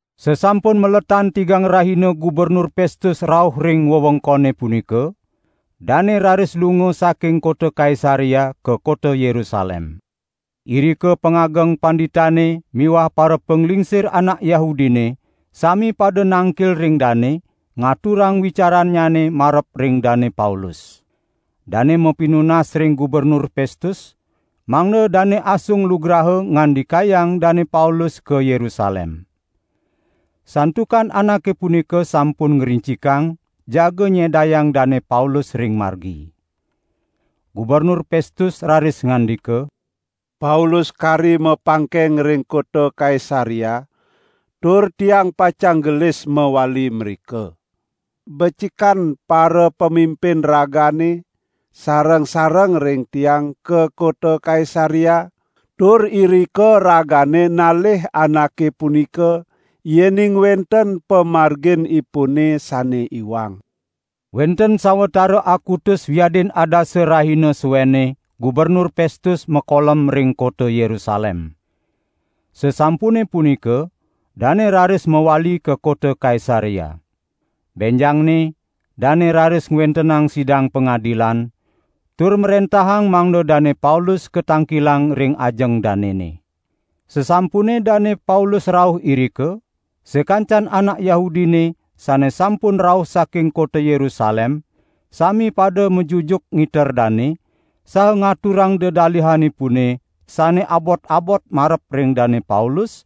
Sasampun maletan tigang rahina Gubernur Pestus rauh ring wewengkone punika, dane raris lunga saking kota Kaisarea ka kota Yerusalem. Irika parapangageng panditane miwah parapanglingsir anak Yahudine sami pada nangkil ring dane, ngaturang wicarannyane marep ring Dane Paulus. Dane mapinunas ring Gubernur Pestus, mangda dane asung lugraha ngandikayang Dane Paulus ka Yerusalem. Santukan anake punika sampun ngrincikang jaga nyedayang Dane Paulus ring margi. Gubernur Pestus raris ngandika: "Paulus kari mapangkeng ring kota Kaisarea, tur tiang pacang gelis mawali mrika. Becikan parapamimpin ragane sareng-sareng ring tiang ka kota Kaisarea, tur irika ragane nalih anake punika yening wenten pamarginipune sane iwang." Wenten sawatara akutus wiadin adasa rahina suenne Gubernur Pestus makolem ring kota Yerusalem. Sasampune punika dane raris mawali ka kota Kaisarea. Benjangne dane raris ngwentenang sidang pangadilan, tur mrentahang mangda Dane Paulus katangkilang ring ajeng danene. Sasampune Dane Paulus rauh irika, sakancan anak Yahudine sane sampun rauh saking kota Yerusalem sami pada majujuk ngiter dane, saha ngaturang dedalihanipune sane abot-abot marep ring Dane Paulus,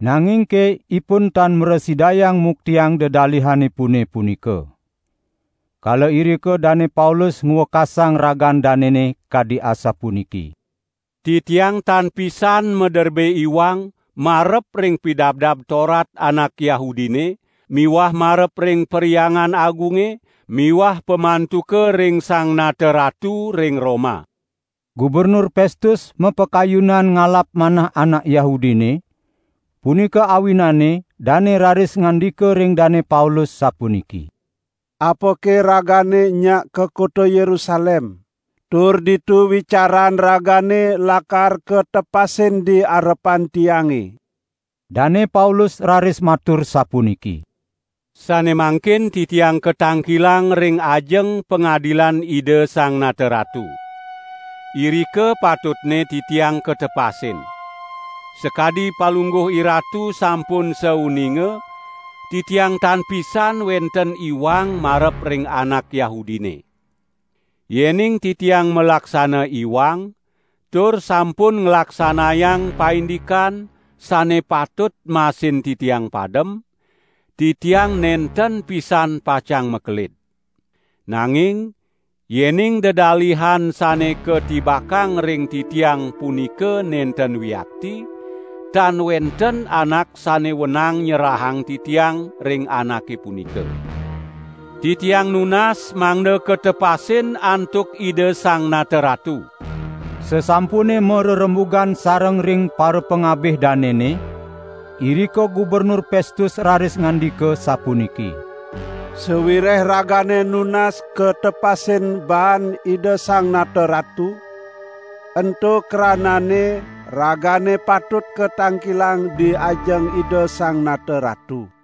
nangingke ipun tan mrasidayang muktiang dedalihanipune punika. Kala irika Dane Paulus ngwekasang ragan danene kadi asapuniki: "Titiang tan pisan maderbe iwang marep ring Pidabdab Torat anak Yahudine miwah marep ring Perhyangan Agunge miwah pamantuka ring Sang Nata Ratu ring Roma." Gubernur Pestus mapakayunan ngalap manah anak Yahudine, punika awinane dane raris ngandika ring Dane Paulus sapuniki: "Apake ragane nyak ka kota Yerusalem, tur ditu wicaran ragane lakar katepasin di arepan tiange?" Dane Paulus raris matur sapuniki: "Sane mangkin titiang katangkilang ring ajeng pangadilan Ida Sang Nata Ratu. Irika patutne titiang katepasin. Sakadi palungguh iratu sampun sauninga, titiang tan pisan wenten iwang marep ring anak Yahudine. Yening titiang malaksana iwang tur sampun nglaksanayang paindikan sane patut masin titiang padem, titiang nenten pisan pacang makelid. Nanging yening dedalihan sane katibakang ring titiang punika nenten wiakti, tan wenten anak sane wenang nyerahang titiang ring anake punika. Titiang nunas mangda katepasin antuk Ida Sang Nata Ratu." Sasampune marerembugan sareng ring parapangabih danene, irika Gubernur Pestus raris ngandika sapuniki: "Sawireh ragane nunas katepasin baan Ida Sang Nata Ratu, ento kranane ragane patut katangkilang di ajeng Ida Sang Nata Ratu."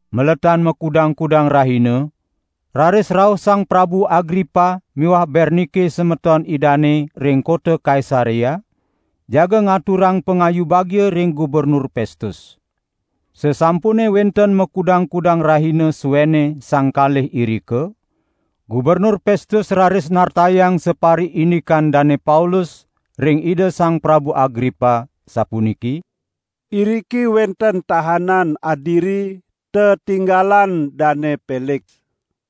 Maletan makudang-kudang rahina, raris rauh Sang Prabu Agripa miwah Bernike semeton idane ring kota Kaisarea, jaga ngaturang pangayu bagia ring Gubernur Pestus. Sasampune wenten makudang-kudang rahina suenne sang kalih irika, Gubernur Pestus raris nartayang sapariindikan Dane Paulus ring Ida Sang Prabu Agripa sapuniki: "Iriki wenten tahanan adiri tetinggalan Dane Peliks.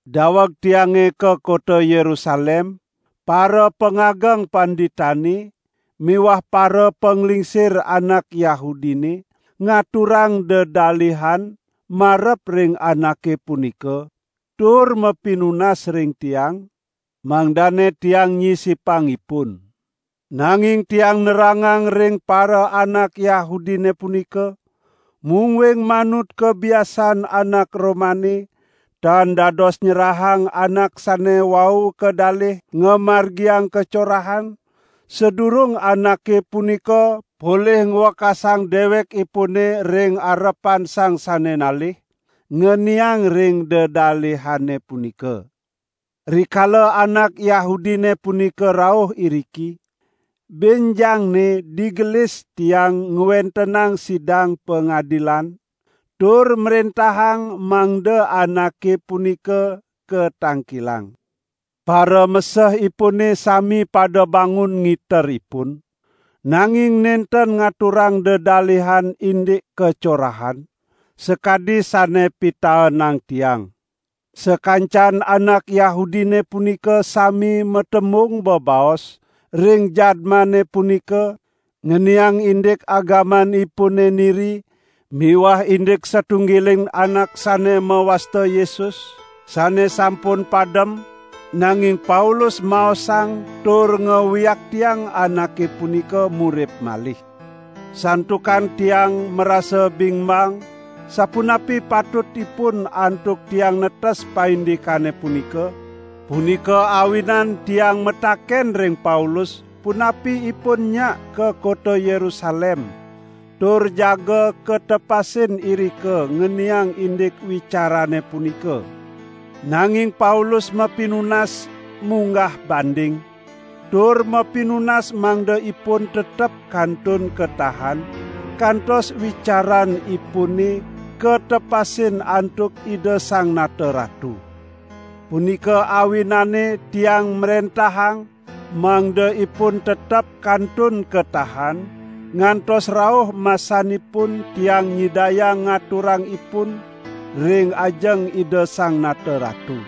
Daweg tiange ka kota Yerusalem, parapangageng panditane miwah parapanglingsir anak Yahudine ngaturang dedalihan marep ring anake punika, tur mapinunas ring tiang, mangdane tiang nyisipang ipun. Nanging tiang nerangang ring paraanak Yahudine punika, mungguing manut kabiasaan anak Romane, tan dados nyerahang anak sane wau kadalih ngamargiang kacorahan, sadurung anake punika polih ngwekasang dewekipune ring arepan sang sane nalih, ngeniang ring dedalihane punika. Rikala anak Yahudine punika rauh iriki, benjangne digelis tiang ngwentenang sidang pangadilan, tur mrentahang mangda anake punika katangkilang. Paramesehipune sami pada bangun ngiter ipun, nanging nenten ngaturang dedalihan indik kacorahan, sakadi sane pitaenang tiang. Sakancan anak Yahudine punika sami matembung bebaos ring jadmane punika ngeniang indik agamanipune niri miwah indik satunggiling anak sane mawasta Yesus, sane sampun padem, nanging Paulus maosang tur ngawiaktiang anake punika murip malih. Santukan tiang marasa bingbang sapunapi patutipun antuk tiang netes paindikane punika, punika awinan tiang mataken ring Paulus punapi ipun nyak ka kota Yerusalem tur jaga katepasin irika ngeniang indik wicarane punika. Nanging Paulus mapinunas munggah banding, tur mapinunas mangda ipun tetep kantun katahan, kantos wicaranipune katepasin antuk Ida Sang Nata Ratu. Punika awinane tiang mrentahang mangda ipun tetep kantun katahan, ngantos rauh masanipun tiang nyidayang ngaturang ipun ring ajeng Ida Sang Nata Ratu."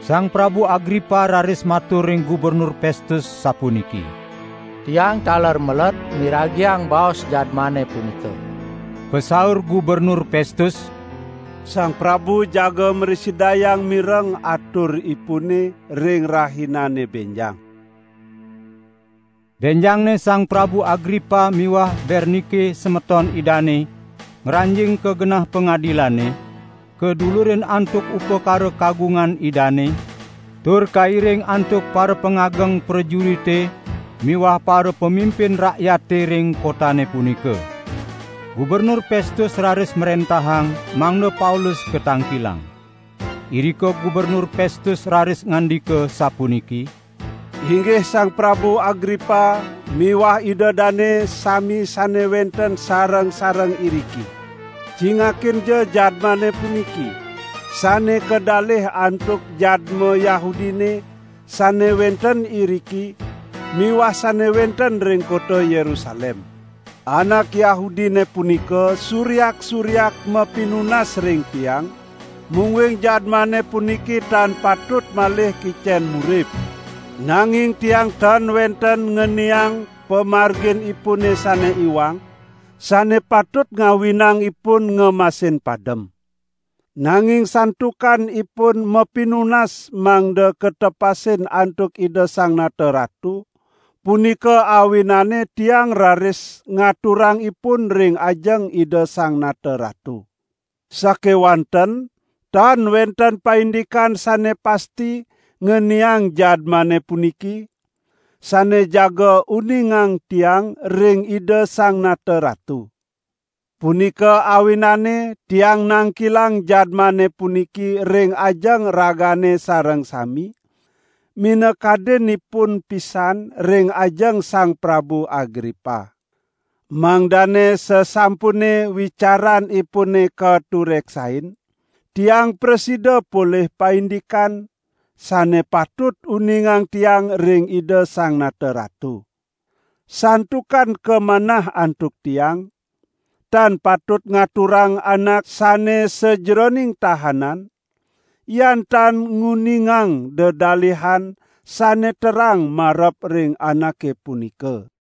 Sang Prabu Agripa raris matur ring Gubernur Pestus sapuniki: "Tiang taler meled miragiang baos jadmane punika." Pasaur Gubernur Pestus: "Sang prabu jaga mrasidayang mireng aturipune ring rahinane benjang." Benjangne Sang Prabu Agripa miwah Bernike semeton idane, ngranjing ka genah pangadilane, kadulurin antuk upakara kagungan idane, tur kairing antuk parapangageng prajurite miwah parapamimpin rakyate ring kotane punika. Gubernur Pestus raris mrentahang mangda Paulus katangkilang. Irika Gubernur Pestus raris ngandika sapuniki: "Inggih Sang Prabu Agripa miwah ida dane sami sane wenten sareng-sareng iriki. Cingakinja jadmane puniki, sane kadalih antuk jadma Yahudine sane wenten iriki miwah sane wenten ring kota Yerusalem. Anak Yahudine punika suryak-suryak mapinunas ring tiang, mungguing jadmane puniki tan patut malih kicen murip. Nanging tiang tan wenten ngeniang pamarginipune sane iwang, sane patut ngawinang ipun ngemasin padem. Nanging santukan ipun mapinunas mangda katepasin antuk Ida Sang Nata Ratu, punika awinane tiang raris ngaturang ipun ring ajeng Ida Sang Nata Ratu. Sakewanten tan wenten paindikan sane pasti ngeniang jadmane puniki, sane jaga uningang tiang ring Ida Sang Nata Ratu. Punika awinane tiang nangkilang jadmane puniki ring ajeng ragane sareng sami, minakadinipun pisan ring ajeng Sang Prabu Agripa. Mangdane sasampune wicaranipune katureksain, tiang prasida polih paindikan, sane patut uningang tiang ring Ida Sang Nata Ratu. Santukan kamanah antuk tiang, tan patut ngaturang anak sane sajeroning tahanan, yan tan nguningang dedalihan sane terang marep ring anake punika."